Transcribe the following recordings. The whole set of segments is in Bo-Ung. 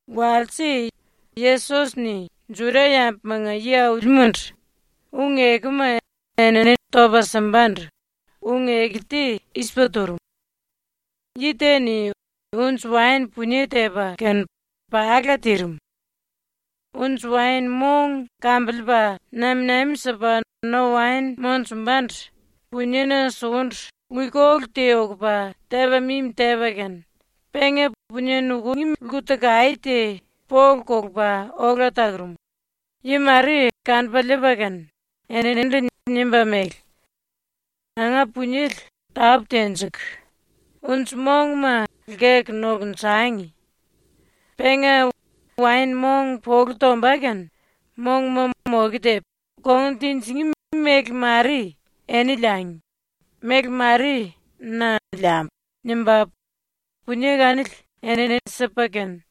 Walse Yesos-ni ⸤Juda-yambumanga yi-aulimandu⸥ ung-ekuma enini topa simbandu ung-eku te i-sipa turum: “Yi te-ni unji-waen punie tepa kene pala tirim. Unji-waen-mong kambiliipa nami-nami sipa no-waen monjumbandu puniena sukundu luikolu te ukupa tepa mimi tepa kene, penga punie nukungí lku-takaé te polu kulupa ola takurum. Yi mare kanupa liipa kene eninindu nimba mele: “Nanga puniele tápu tenjiku unji-monguma lkeku nokunjangi. Penga waen-mong polu tomba kene monguma moke tepu, kongun tinjingí méle-mare eni liangi, méle-mare na liambu.” nimba punie kanili enini sipa kene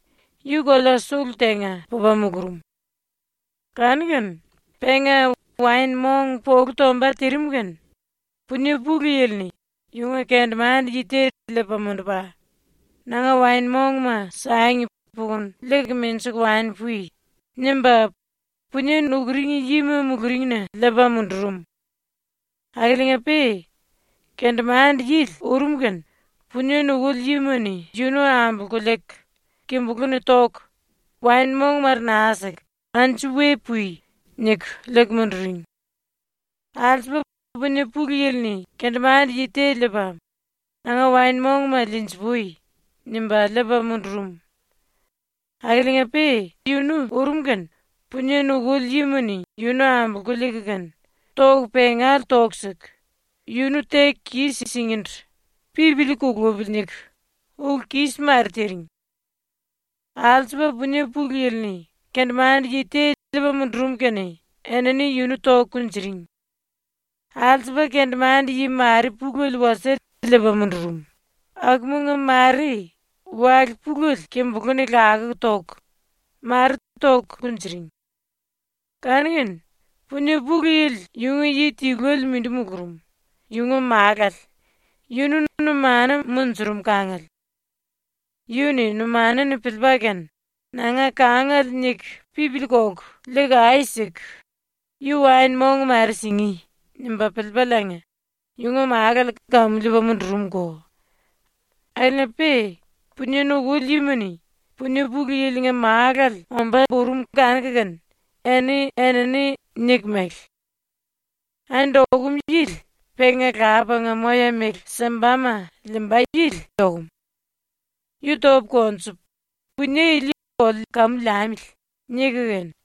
yu kolea ⸤sulu⸥ tenga pupa mulurum. Kanu-kene penga waen-mong polu tomba tirim kene punie pulu yili-ni yunga kendemande-yi te liipa mundupa “Nanga waen-mongma sangi pukunu liiku menjiku wani pui.” nimba punie nukuring yima muluringna liipa mundurum. Akiliinga-pe kendemande-yili ⸤urum kene⸥ punie nukuli yima-ni yunu ambolku liiku kimbulú-ni toku waen-mong mare naa siku “Anju we pui.” niku liiku munduring. Alsupa punie pulu yili-ni kendemande-yi te liipa ⸤“Nanga waen-mongma liinji-pui.” nimba liipa⸥ mundurum. Akiliinga-pe yunu ⸤urum kene⸥ punie nukuli yima-ni yunu ambolku liiku kene toku pengale toku siku yunu teku kis-singíndu ‘Pipili kulupili.’ niku ulu kis mare tiring. Alsupa punie pulu yili-ni kendemande-yi te liipa mundurum kene enini yunu toku kunjuring. Alsupa kendemande-yi mare pulele wasie liipa mundurum, akumanga mare wale pulele kimbulú-ni lakuku toku, mare toku kunjuring. Kanu-kene punie pulu yili yunga yi tiluele mindi mulurum, yunga málale, yunu numanu munjurum kangale. Yu-ni ⸤numanale-ni piliipa kene⸥ ‘ ‘Nanga kangale’ niku pipili kolku liiku ai siku, yu waen-mong mare singí.’ nimba piliipaliinga yunga málale kamu liipa mundurumko. Akiliinga-pe punie nukuli yima-ni punie pulu yilinga málale ombá urum kanuku kene eni-enini niku mele: “Andi okum yili penga lapanga moya-méle simbama liimba yili okum. Yu topu konjupu punie ili oliu kamu liamili.” niku kene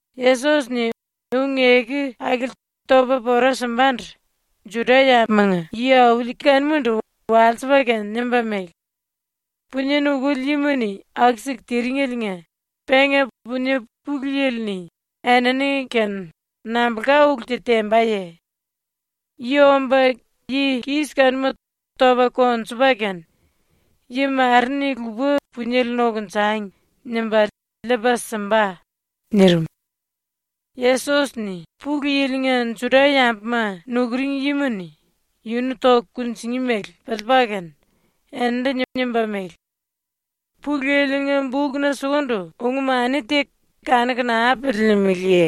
⸤Yesos-ni ung-eku akili topa pora simbandu Juda-yambumanga yi-auli kanumandu walsipa kene nimba mele:⸥ “Punie nukuli yima-ni aku-siku tiringeliinga penga punie pulu yili-ni enini-kene nambulka ulu te tembaye? Yu omba yi kis kanuma topa konjupa kene ‘Yi mare-ni lupa puniele nokunjangi.’ nimba liipa simba.” ⸤nirim.⸥ ⸤Yesos-ni Pulu Yili-nga Juda-yambuma nukuring yima-ni yunu toku kunjingí mele piliipa kene eninindu nimba mele:⸥ “Pulu Yili-nga bukna sukundu ung-mani te kanuku naa piliilimiliye?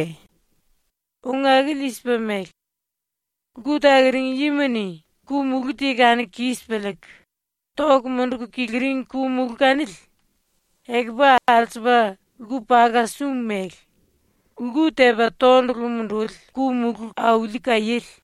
⸤Ung akili i-sipa mele:⸥ ‘Lku takuring yima-ni ku-mulú te kanuku kis piliiku toku munduku kiliring ku-mulú kanili ekupu alsupa lku-paka-sum mele lku tepa tondulu munduli ku-mulú auli kaiéle.’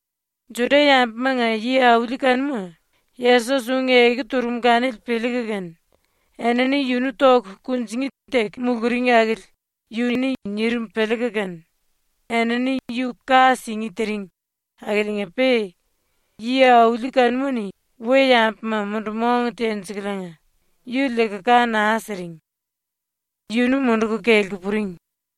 ⸤Juda-yambumanga yi-auli kanuma⸥ Yesos ung-eku turum kanili piliiku kene enini yunu toku kunjingí teku muluring akili yu-ni nirim piliiku kene enini yu ka singí tiring akiliinga-pe yi-auli kanuma-ni we-yambuma mundu-mong tenjikuliinga yu liiku ka naa siring. Yunu munduku kelku puring.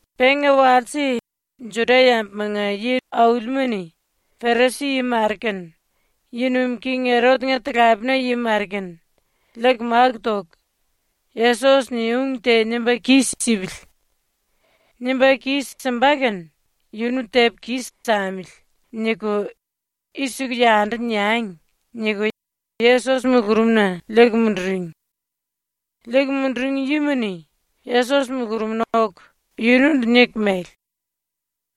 Penga walse ⸤Juda-yambumanga yi-aulima-ni⸥ Perisi-yi mare kene yi nuim king Erot-nga talapena yi mare kene liiku máku toku, “‘Yesos-ni ung te nimba kis-sipili. Nimba kis-simba kene yunu tepu kis-samili.’ niku i-siku yundu niangi.” niku Yesos mulurumna liiku munduring. Liiku munduring yima-ni Yesos mulurumna oku yunundu niku mele: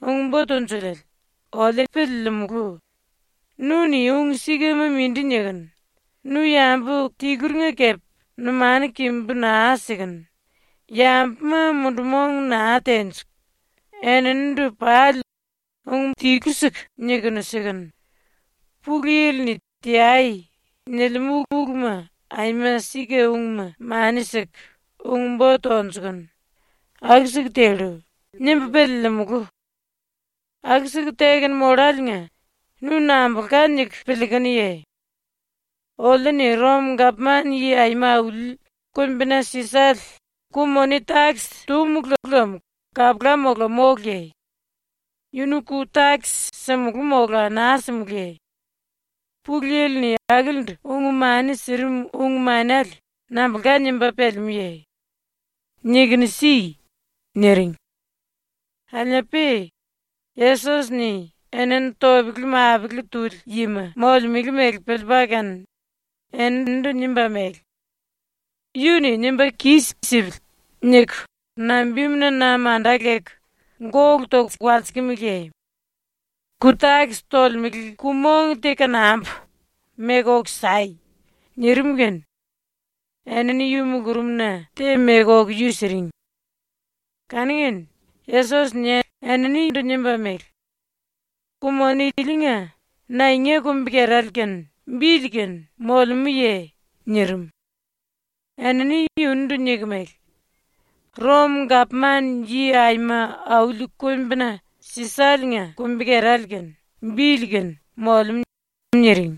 “Ung-Bo Tunjuliele, oliu piliilimulu, ‘Nu-ni ung-sikama mindi nikunu, nu yambu tiluringa kepe numanu kimbu naa sikunu, yambuma mundu-mong naa tenjiku eninindu pali ung tilu-siku nikunu sikunu, Pulu Yili-ni “Teai.” nilimú uluma aima sika-ungma mani siku ung-bo tonjukunu, aku-siku tellu.’ nimbu piliilimulu. ⸤Aku-siku tekunu molláliinga nu nambulka niku piliikunuye?⸥ Oliu-ni Rom-Gapman-Yi Aima Auli Kumbina Sisale ku-moni-takis túmulu lem kapula mola móluye? Yunu ⸤ku-takis⸥ simulú mola naa simulúye? Pulu Yili-ni akilindu ung-mani sirim ung-manele nambulka nimba pelemúye? Nikunu si.” niring. Akiliinga-pe Yesos-ni enini topele-mapele tuli yima molemele mele piliipa kene eninindu nimba mele: “‘Yu-ni nimba kis-sipili.’ niku nambimuna na manda leku gólu toku walsikimiliye? ⸤Ku-takis tolemele⸥ ku-mong te kanambu, meku oku sai.” nirim kene enini yu mulurumna te meku oku yu siring. Kanu-kene Yesos-ni eninindu nimba mele: “Ku-moni ilinga naenga kumbi-kerale kene bili kene molemúye?” nirim. Enini yunundu niku mele: “Rom-Gapman-Yi Aima Auli Kumbina Sisale-nga kumbi-kerale kene bili kene molemú.” niring.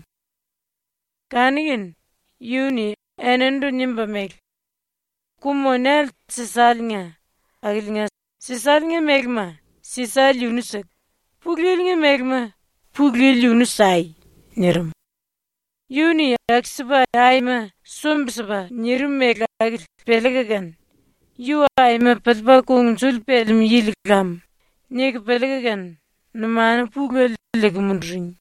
Kanu-kene yu-ni eninindu nimba mele: “⸤Ku-monele Sisale-nga⸥ akiliinga Sisale-nga mélema Sisale yunu siku, Pulu Yili-nga mélema Pulu Yili yunu sai.” nirim. Yu-ni aku-sipa ⸤aima sumbi-sipa⸥ nirim mele akili piliiku kene ⸤‘Yu aima piliipa kungnjuli pelemú yili lam.’ niku piliiku kene⸥ numanu pulele liiku munduring.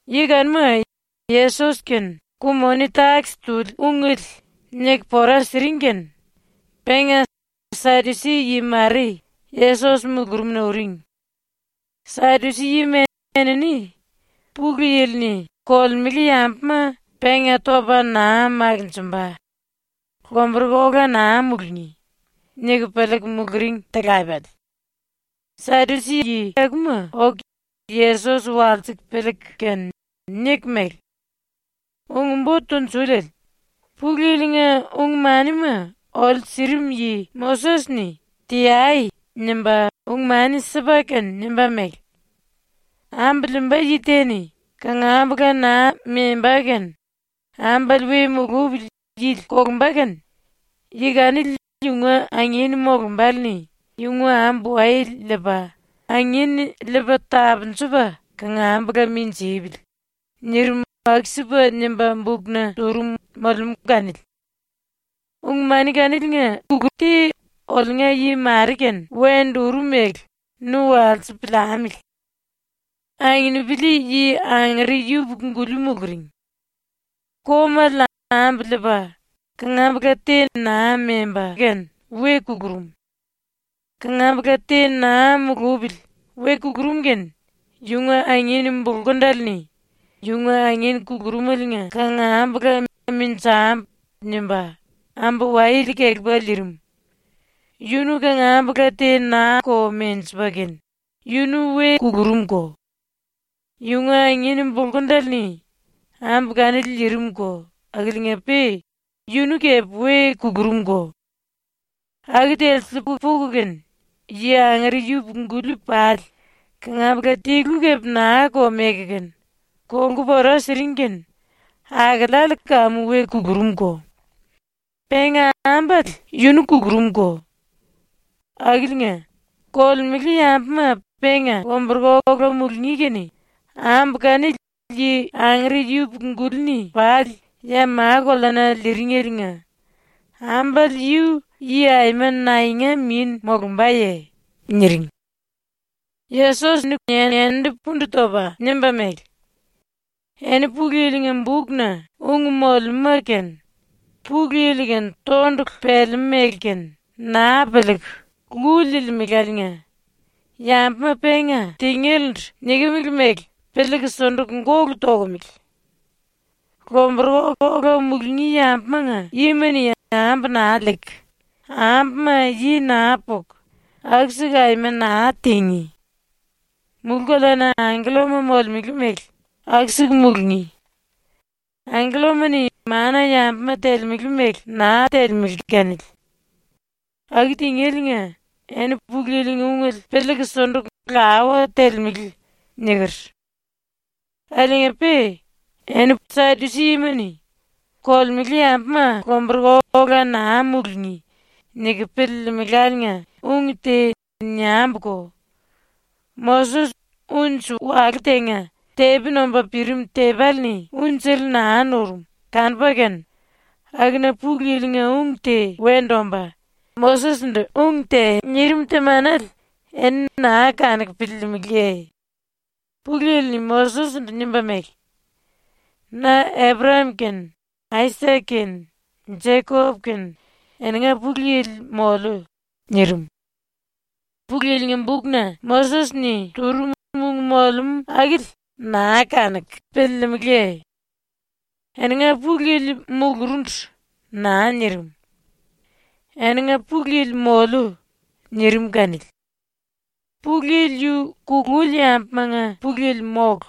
⸤Yi kanuma Yesos kene ku-moni-takis tuli ungele niku pora siring kene⸥ penga Sadusi-yi mare Yesos mulurumna uring. Sadusi-yima enini ‘Pulu Yili-ni kolemele yambuma penga topa naa makinjimba, lomburuku ola naa mulungí.’ niku piliiku muluring talapele. Sadusi-yi akuma oku Yesos walsiku piliiku kene niku mele: “Ung-Bo Tunjuliele, ⸤Pulu Yili-nga ung-manima oliu sirim yi⸥ Moses-ni ⸤“Teai!” nimba⸥ ung-mani sipa kene nimba mele: “Ambu liimba yi te-ni kangambula naa memba kene ambale we mulupili yili kolumba kene yi kanili yunga angin molumbále-ni yunga ambu-wayele liipa angin liipa tapunjupa kangambula minjipili.” nirim aku-sipa nimba bukna turum molemú kanili. ⸤Ung-mani kaniliinga ulu te oliunga yi mare-kene wendu urum mele nu walsipu piliamili.⸥ “Anginipili-yi angere yupuku-guli muluring. Komale ambu liipa kangambula te naa memba kene we kulurum. ⸤Kangambula te naa mulupili we kulurum kene⸥ yunga anginu bulkundele-ni ⸤yunga angin kulurumeliinga kangambula ‘Menjambu.’ nimba⸥ ambu-wayele kelepa liirim. Yunu kangambula te naa-ko menjipa kene yunu we kulurumko. Yunga angin bulkundele-ni ambu kanili liirimko akiliinga-pe yunu kepe we kulurumko. Aku telsiliiku puku kene yi angere yupuku-guli pali kangambula tilu kepe naa-ko meku kene kolku pora siring kene akeleale kamu we kulurumko. Penga ambale yunu kulurumko. Akiliinga, kolemele yambuma penga lomburuku ola mulungí kene ambu kanili yi angere yupuku-guli-ni pali ya ma-koleana liiringeliinga ambale yu yi aima naenga min molumbaye?” niring. Yesos-ni eninindu pundu topa nimba mele: “Eni Pulu Yili-nga bukna ung molemúma kene, Pulu Yili-kene tondulu pelemú mele kene, naa piliiku lu liilimeláliinga ⸤yambuma penga tengélendu nikimili mele piliiku sunduku gólu tokomele⸥. Lomburuku ola mulungí yambumanga yima-ni ambu naa liiku, ambuma yi naa puku, aku-siku aima naa tingí. Mulú-koleana angkellama molemele mele aku-siku mulungí. ⸤Angkellama-ni mana-yambuma telemele mele naa telemele kanili.⸥ Aku tingéliinga ⸤‘Eni Pulu Yili-nga ungele piliiku sunduku lawa telemele.’ niker⸥. “Akiliinga-pe ⸤eni Sadusi-yima-ni⸥ ‘Kolemele yambuma lomburuku ola naa mulungí.’ niku piliilimeláliinga ung te niambuko. Moses unji walú tenga ⸤tepi nomba pirim tepéle-ni unjele naa nurum kanupa kene⸥ akuna Pulu Yili-nga ung te wendu omba Moses-ndu ung te nirim temanele eni naa kanuku piliilimiliye? Pulu Yili-ni Moses-ndu nimba mele: “Na Eprayam kene Aisak kene Jekop kene eninga Pulu Yili moliu.” nirim. Pulu Yili-nga bukna Moses-ni turum ung molemú akili naa kanuku piliilimiliye? ⸤‘Eninga Pulu Yili mulurundu.’ naa nirim. ‘Eninga Pulu Yili moliu.’ nirim kanili.⸥ Pulu Yili yu kululi yambumanga Pulu Yili mólu;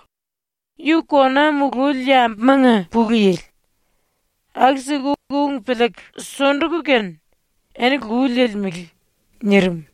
yu kona mululi yambumanga Pulu Yili. Aku-siku ung piliiku sunduku kene eni lu liilimele.” nirim.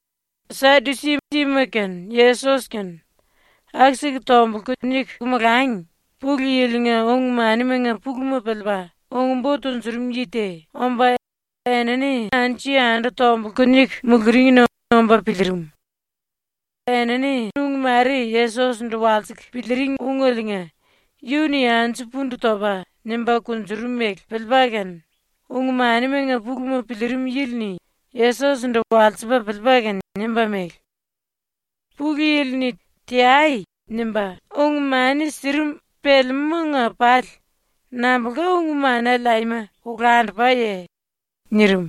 ⸤Sadusi-yima kene Yesos kene⸥ aku-siku tombulku niku molangi Pulu Yili-nga ung-manimanga puluma piliipa ung-bo tunjurum yi te omba enini anju-yandu tombulku niku muluringna omba piliirim. Enini ung mare Yesos-ndu walsiku piliiring ungeliinga yu-ni anju pundu topa nimba kunjurum mele piliipa kene ung-manimanga puluma piliirim yili-ni Yesos-ndu walsipa piliipa kene nimba mele: “Pulu Yili-ni ⸤“Teai!” nimba⸥ ung-mani sirim pelemúmanga pali nambulka ung-manele aima olandupaye?” nirim.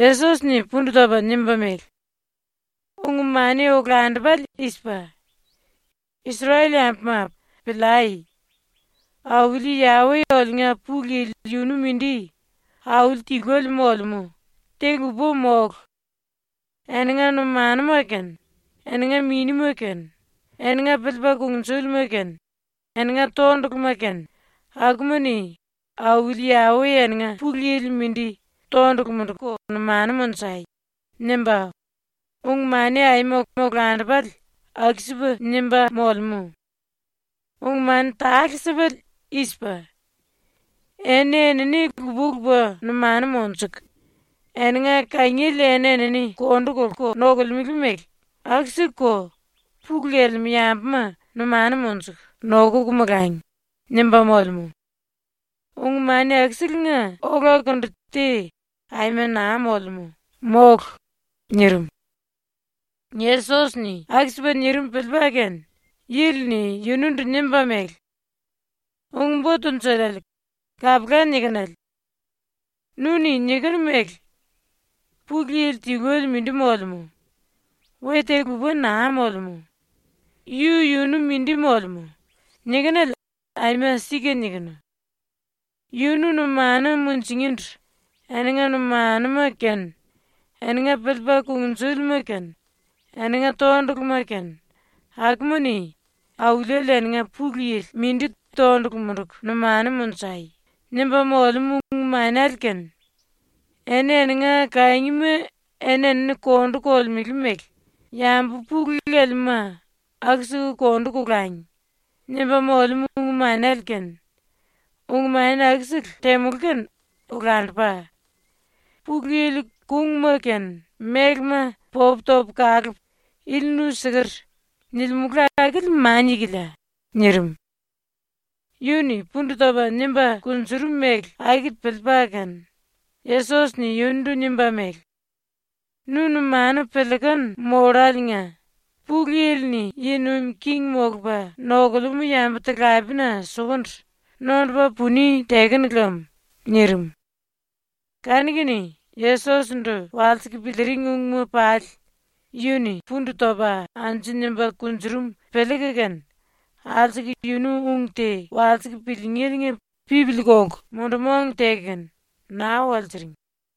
Yesos-ni pundu topa nimba mele: “Ung-mani olandupale i-sipa: ‘Isrel-yambuma, piliai! Auli Yawe oliunga Pulu Yili yunu mindi Auli tiluele molemú, te lupa mólu. Eninga numanuma kene, eninga minima kene, eninga piliipa kungnjúlima kene, eninga tonduluma kene, akuma-ni Auli Yawe eninga Pulu Yili mindi tondulu munduku numanu monjai.’ nimba, ung-mani aima olandupale aku-sipa ⸤nimba⸥ molemú. Ung-mani tale-sipale i-sipa: ‘Eni-enini lupa-lupa numanu monjuku eninga kangiele eni-enini kondu kolku nokolemele mele aku-sikuko pulu lelemú yambuma numanu monjuku nokuku molangi.’ nimba molemú. Ung-mani akuselenga olakundu te aima naa molemú, mólu.” nirim. ⸤Yesos-ni aku-sipa nirim piliipa kene⸥ yili-ni yunundu nimba mele: “Ung-Bo Tunjuliele, kapula nikinele. Nu-ni nikunu mele: “Pulu Yili tiluele mindi molemú. We te lupa naa molemú. Yu-yunu mindi molemú.” nikinele aima sika nikinu. ‘Yunu numanu munjingíndu eninga numanuma kene, eninga piliipa kungnjúlima kene, eninga tonduluma kene, akuma-ni ⸤Auliele eninga Pulu Yili⸥ mindi tondulu munduku numanu monjai.’ nimba molemú ung-manele kene ‘Eni-eninga kangima eni-enini kondu kolemele mele yambu pulu lelemúma aku-siku kondu kolangi.’ nimba molemú ung-manele kene, ung-mani akusele temulú kene olandupa; Pulu Yili kungma kene mélema popu topu kalupu “Ili nu siker.” nilimulu akili mania-kilia.” nirim. Yu-ni pundu topa nimba kunjurum mele akili piliipa kene Yesos-ni yunundu nimba mele: “Nu numanu piliikunu molláliinga Pulu Yili-ni yi nuim king molupa nokulemú yambu-talapena sukundu nondupa puni tekenu lem.” nirim. Kanu-kene ⸤Yesos-ndu walsiku piliiring ungma pali yu-ni pundu topa anju nimba kunjurum piliiku kene⸥ alsuku yunu ung te walsiku piliingéliinga pipili kolku mundu-mong teku kene naa walsiring.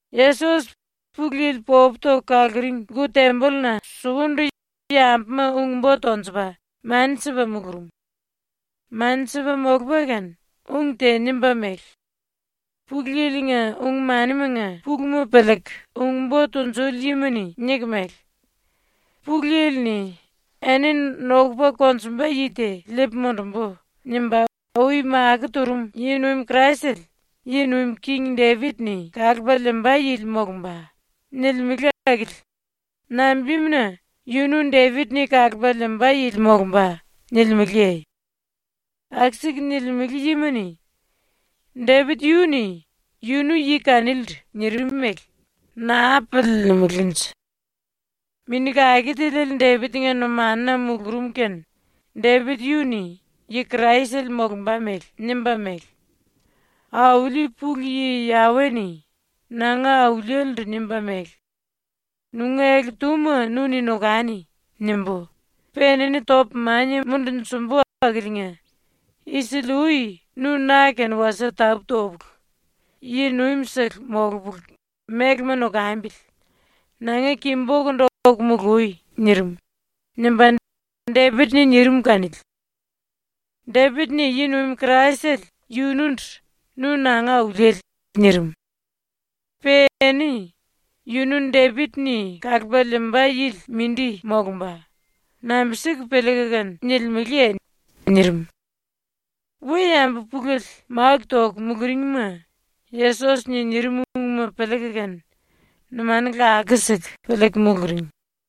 Yesos ⸤Pulu Yili popu toku kaluring⸥ lku-tembolluna sukundu yambuma ung-bo tonjupa mani sipa mulurum. Mani sipa molupa kene ung te nimba mele: “Pulu Yili-nga ung-manimanga puluma piliiku ung-bo tunjuli yima-ni niku mele: “Pulu Yili-ni “Enini nokupa konjumba yi te liipu mundumbu.” nimba ui makó turum yi-nuim Kraisele ⸤yi nuim king⸥ Depit-ni kalupa liimba yili molumba.” nilimele akili nambimuna “Yunu Depit-ni kalupa liimba yili molumba.” nilimeleye? ⸤Aku-siku nilimele yima-ni⸥ Depit yu-ni yunu ⸤yi kanilindu nirim mele naa piliilimilinje.⸥ Mini Kake Tiliele Depit-nga numanuna mulurum kene Depit yu-ni ⸤yi Kraisele molumba mele⸥ nimba mele: “Auli ⸤Pulu Yi Yawe-ni⸥ nanga Auliele-ndu nimba mele: “‘Nunga ele-túma nu-ni nokani.’ nimbu, pe enini topu mania mundunjumbu akiliinga isili-ui nu ⸤na kene wasie tapú topulu yi-nuimsele molupulu mélema nokambili⸥ nanga ki-bokundu oku molui.” nirim.” nimba Depit-ni nirim kanili. Depit-ni ⸤yi-nuim Kraisele⸥ yunundu “Nu nanga Auliele.” nirim. Pe eni “Yunu Depit-ni kalupa liimba yili ⸤mindi⸥ molumba.” nambi-siku piliiku kene nilimeleye?” nirim. We-yambu pulele máku toku muluringma Yesos-ni nirim ungma piliiku kene numanu lakuku siku piliiku muluring.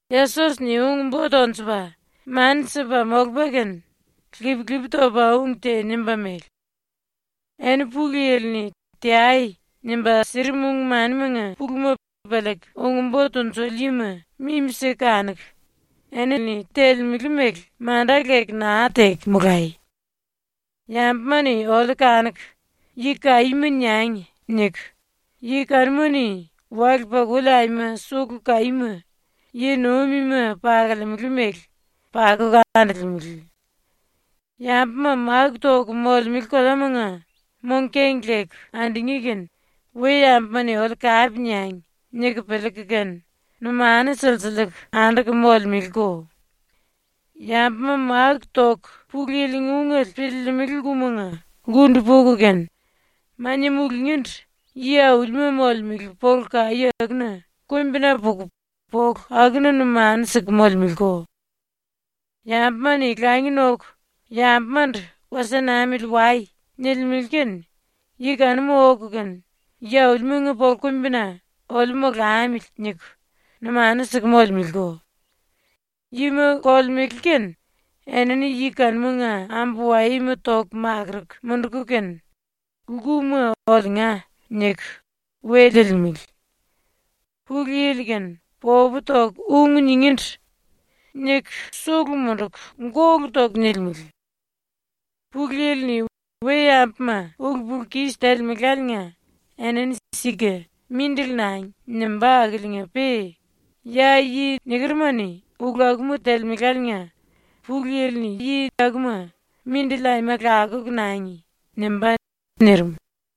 Yesos-ni ung-bo tonjupa mani sipa molupa kene ⸤lip-lipi topa⸥ ung te nimba mele: “Eni Pulu Yili-ni ⸤“Teai!” nimba sirim⸥ ung-manimanga puluma piliiku ung-bo tunjuli yima mimi-siku kanuku ⸤enini telemele mele manda leku naa teku⸥ molai. ⸤‘Yambuma-ni oliu kanuku “Yi kaíma” niangi.’ niku⸥ yi kanuma-ni wale-pakuli aima sulu kaíma, ⸤yi-nuimima pakolemele mele,⸥ pakuku andolemele. Yambuma máku toku molemele koleamanga mong-keng leku andungí kene ‘We-yambuma-ni oliu kape niangi.’ niku piliiku kene numanu silsiliiku anduku molemeleko. Yambuma máku toku Pulu Yili-nga ungele piliilimili lkumanga lkundu puku kene mania mulungíndu yi aulima molemele polu kaí akuna kumbina puku polu akuna numanu siku molemeleko. Yambuma-ni langi noku yambumandu “Wasie namili wai.” nilimele kene yi kanuma oku kene yi-aulimanga polu-kumbina ‘oliu molamili.’ niku numanu siku molemeleko. “Yima kolemele kene enini yi kanumanga ambu-wayema toku makuruku munduku kene lkuma ‘Oliunga’ niku we liilimele. Pulu Yili-kene popu toku ung ningíndu niku sulu munduku gólu toku nilimele. Pulu Yili-ni we-yambuma ulu-pulu-kis telemeláliinga enini sika “Mindili nangi.” nimbá akiliinga-pe ya yi nikeruma-ni ulu akuma telemeláliinga Pulu Yili-ni yi akuma “Mindili aima lakuku nangi.” nimbá.” nirim.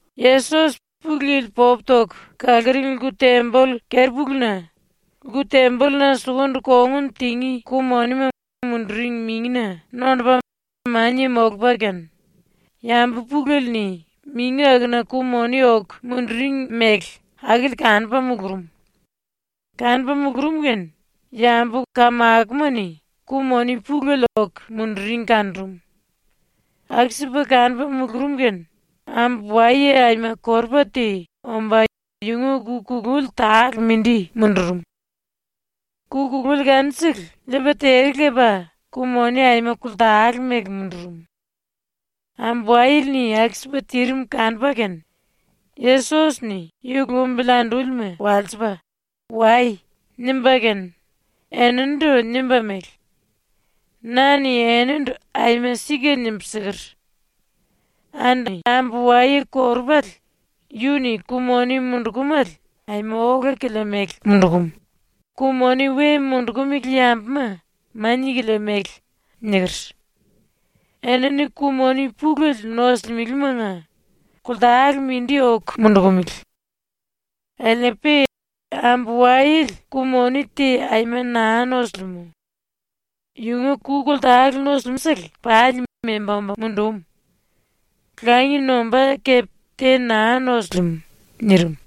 Yesos ⸤Pulu Yili popu toku kaluring lku-temboll⸥ keri-puluna lku-tembolluna sukundu kongun tingí ku-monima munduring mingina nondupa mania molupa kene yambu pulele-ni mingi akuna ku-moni oku munduring mele akili kanupa mulurum. Kanupa mulurum kene yambu kamakoma-ni ku-moni pulele oku munduring kanurum. ⸤Aku-sipa kanupa mulurum kene⸥ ambu-waye aima korupa te omba yunga ku-kululi tale mindi mundurum. Ku-kululi kanusele liipa tere lepa ku-moni aima koltale mele mundurum. ⸤Ambu-wayele-ni aku-sipa tirim kanupa kene⸥ Yesos-ni yu lumbili andúlima walsipa “Wai.” nimba kene eninindu nimba mele: “Na-ni enindu aima sika nimbu siker: “Andi ambu-waye korupale yu-ni ku-moni mundukumele aima ola-kilia mele mundukum, ku-moni we mundukumili yambuma mania-kilia mele.” niker. Enini ku-moni pulele nosulimelemanga koltale mindi oku mundukumele. Akiliinga-pe ambu-wayele ku-moni te aima naa nosilimú. Yunga ku koltale nusum-sele pali memba omba mundum. Langi nombá kepe te naa nosilimú.” nirim.